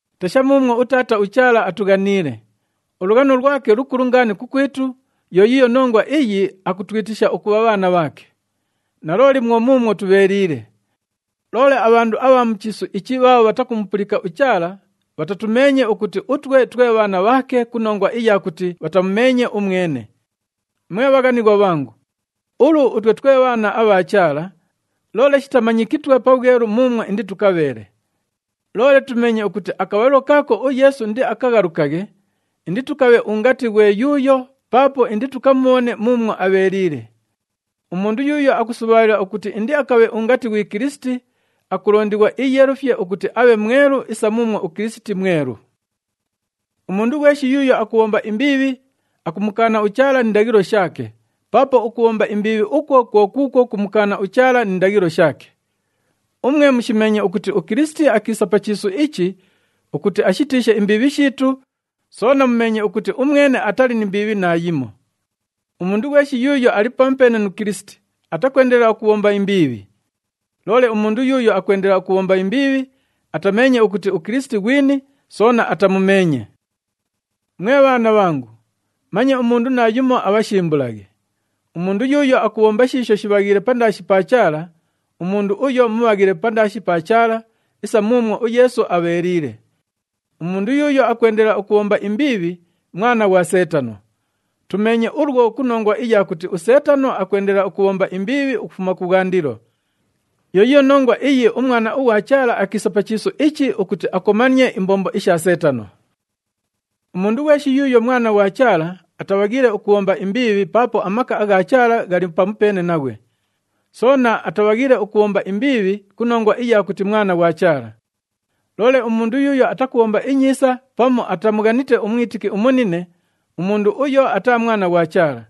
Tesha muumwo uTaata uChaala atughaniile! Ulughano lwake lukulu ngaani kukwitu, yo yiiyo nongwa iyi akutwitisha ukubha bhaana bhaake. Nalooli, mwo muumwo tubheeliile. Loole abhandu abha mu chiisu ichi bhaabho bhatakumupulika uChaala bhatatumeenye ukuti utwe twe bhaana bhaake ku nongwa iya kuti bhatamumeenye umwene. Mwe bhaghanighwa bhangu, ulu utwe twe bhaana abha Chaala, loole shitamanyikitwe pabhwelu muumwo inditukabheele. Loole tumeenye ukuti akabhalilo kaako uYeesu indiakaghalukaghe, inditukabhe ungati ghwe yuuyo paapo inditukamubhone muumwo abheeliile. Umundu yuuyo akusubhaalila ukuti indiakabhe ungati ghwi Kilisiti, akulondighwa iiyeelufye ukuti abhe mwelu isa muumwo uKilisiti mwelu. Umundu ghweshi yuuyo akubhomba imbiibhi, akumukaana uChaala ni ndaghilo shaake. Paapo ukubhomba imbiibhi ukwo kwo kuukwo kumukaana uChaala ni ndaghilo shaake. Umwe mushimeenye ukuti uKilisiti akiisa pa chiisu ichi ukuti ashitiishe imbiibhi shiitu, soona mumeenye ukuti umwene atali ni mbiibhi naayimo. Umundu ghweshi yuuyo ali pamupeene nu Kilisiti, atakwendelela ukubhomba imbiibhi. Loole umundu yuuyo akwendelela ukubhomba imbiibhi, atameenye ukuti uKilisiti ghwini soona atamumeenye. Mwe bhaana bhangu, manye umundu naayumo abhashimbulaghe. Umundu yuuyo akubhomba shiisho shibhaghiile pandaashi pa Chaala, umundu uyo mubhaghile pandaashi pa Chaala isa muumwo uYeesu abheeliile. Umundu yuuyo akwendelela ukubhomba imbiibhi, mwana ghwa Seetano. Tumeenye ulwo ku nongwa iya kuti uSeetano akwendelela ukubhomba imbiibhi ukufuma kubhwandilo. Yo yiiyo nongwa iyi uMwana ughwa Chaala akiisa pa chiisu ichi ukuti akomanie imbombo isha Seetano. Umundu ghweshi yuuyo mwana ghwa Chaala, atabhaghiile ukubhomba imbiibhi paapo amaka agha Chaala ghali pamupeene naghwe. Soona atabhaghiile ukubhomba imbiibhi ku nongwa iya kuti mwana ghwa Chaala. Loole umundu yuuyo atakubhomba inyiisa pamu atamughanite umwitiki umunine, umundu uyo ataa mwana ghwa Chaala.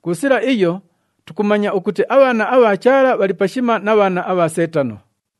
Ku sila iyo, tukumanya ukuti abhaana abha Chaala bhali pashima na bhaana abha Seetano.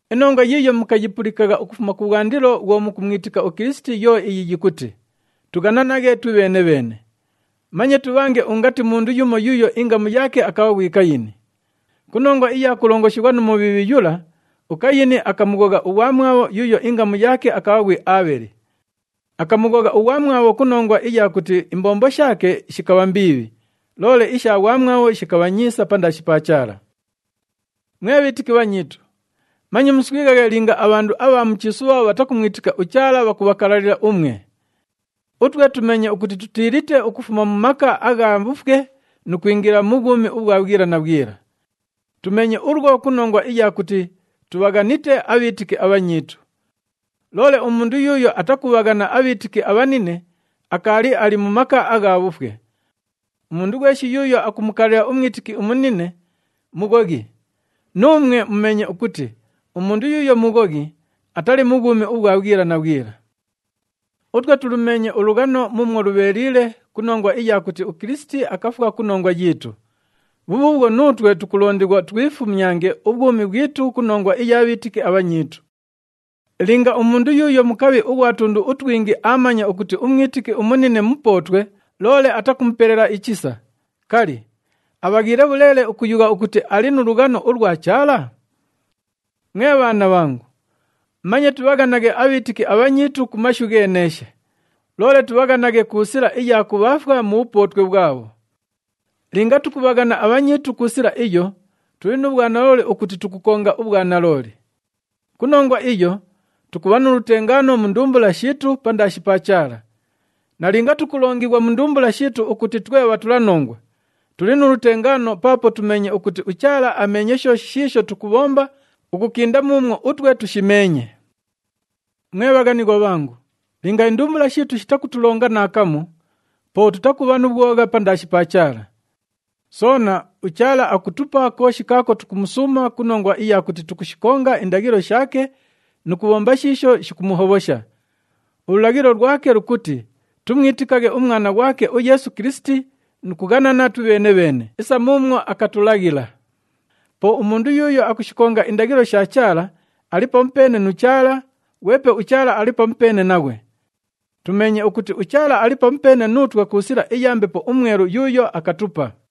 Inongwa yiiyo mukayipulikagha ukufuma kubhwandilo bhwo mukumwitika uKilisiti yo iyi yikuti, “Tughananaghe twibheene-bheene.” Manye tubhange ungati mundu yumo yuuyo ingamu yaake akabha ghwi Kayini. Ku nongwa iya kulongoshighwa nu Mubhiibhi yula, uKayini akamughogha ughwamwabho yuuyo ingamu yaake akabha ghwi Aabheli. Akamughogha ughwamwabho ku nongwa iya kuti imbombo shaake shikabha mbiibhi, loole isha ghwamwabho shikabha nyiisa pandaashi pa Chaala. Mwe bhiitiki bhanyiitu, manye muswighaghe linga abhandu abha mu chiisu bhaabho bhatakumwitika uChaala bhakubhakalalila umwe. Utwe tumeenye ukuti tutiilite ukufuma mu maka agha bhufwe nu kwingila ku bhwumi ubhwa bhwila na bhwila. Tumeenye ulwo ku nongwa iya kuti tubhaghanite abhiitiki abhanyiitu. Loole umundu yuuyo atakubhaghana abhiitiki abhanine, akaali ali mu maka agha bhufwe. Umundu ghweshi yuuyo akumukalalila umwitiki umunine, mughoghi. Nuumwe mumeenye ukuti umundu yuuyo mughoghi, atali nu bhwumi ubhwa bhwila na bhwila. Utwe tulumeenye ulughano muumwo lubheeliile ku nongwa iya kuti uKilisiti akafwa ku nongwa yiitu. Bhubhuubhwo, nuutwe tukulondighwa twifumyange ubhwumi bhwitu ku nongwa iya bhiitiki abhanyiitu. Linga umundu yuuyo mukabhi ughwa tundu utwingi aamanya ukuti umwitiki umunine mupootwe, loole atakumupelela ichisa, kali, abhaghiile bhuleele ukuyugha ukuti ali nu lughano ulwa Chaala? Mwe bhaana bhangu, manye tubhaghanaghe abhiitiki abhanyiitu ku mashu gheeneeshe, loole tubhaghanaghe ku sila iya kubhaafwa mu bhupootwe bhwabho. Linga tukubhaghana abhanyiitu ku sila iyo, tuli nu bhwanalooli ukuti tukukonga ubhwanalooli. Ku nongwa iyo, tukubha nu lutengaano mu ndumbula shiitu pandaashi pa Chaala. Nalinga tukulongighwa mu ndumbula shiitu ukuti twe bhatulanongwa, tuli nu lutengaano paapo tumeenye ukuti uChaala ameenye shooshi shiisho tukubhomba ukukinda muumwo utwe tushimeenye. Mwe bhaghanighwa bhangu, linga indumbula shiitu shitakutulonga naakamu, po tutakubha nu bhwogha pandaashi pa Chaala. Soona, uChaala akutupa kooshi kaako tukumusuuma ku nongwa iya kuti tukushikonga indaghilo shaake nu kubhomba shiisho shikumuhobhosha. Ululaghilo lwake lukuti tumwitikaghe uMwana ghwake uYeesu Kilisiti nu kughanana twibheene-bheene isa muumwo akatulaghila. Po umundu yuuyo akushikonga indaghilo isha Chaala ali pamupeene nu Chaala, ghwepe uChaala ali pamupeene naghwe. Tumeenye ukuti uChaala ali pamupeene nuutwe ku sila iya Mbepo uMwelu yuuyo akatupa.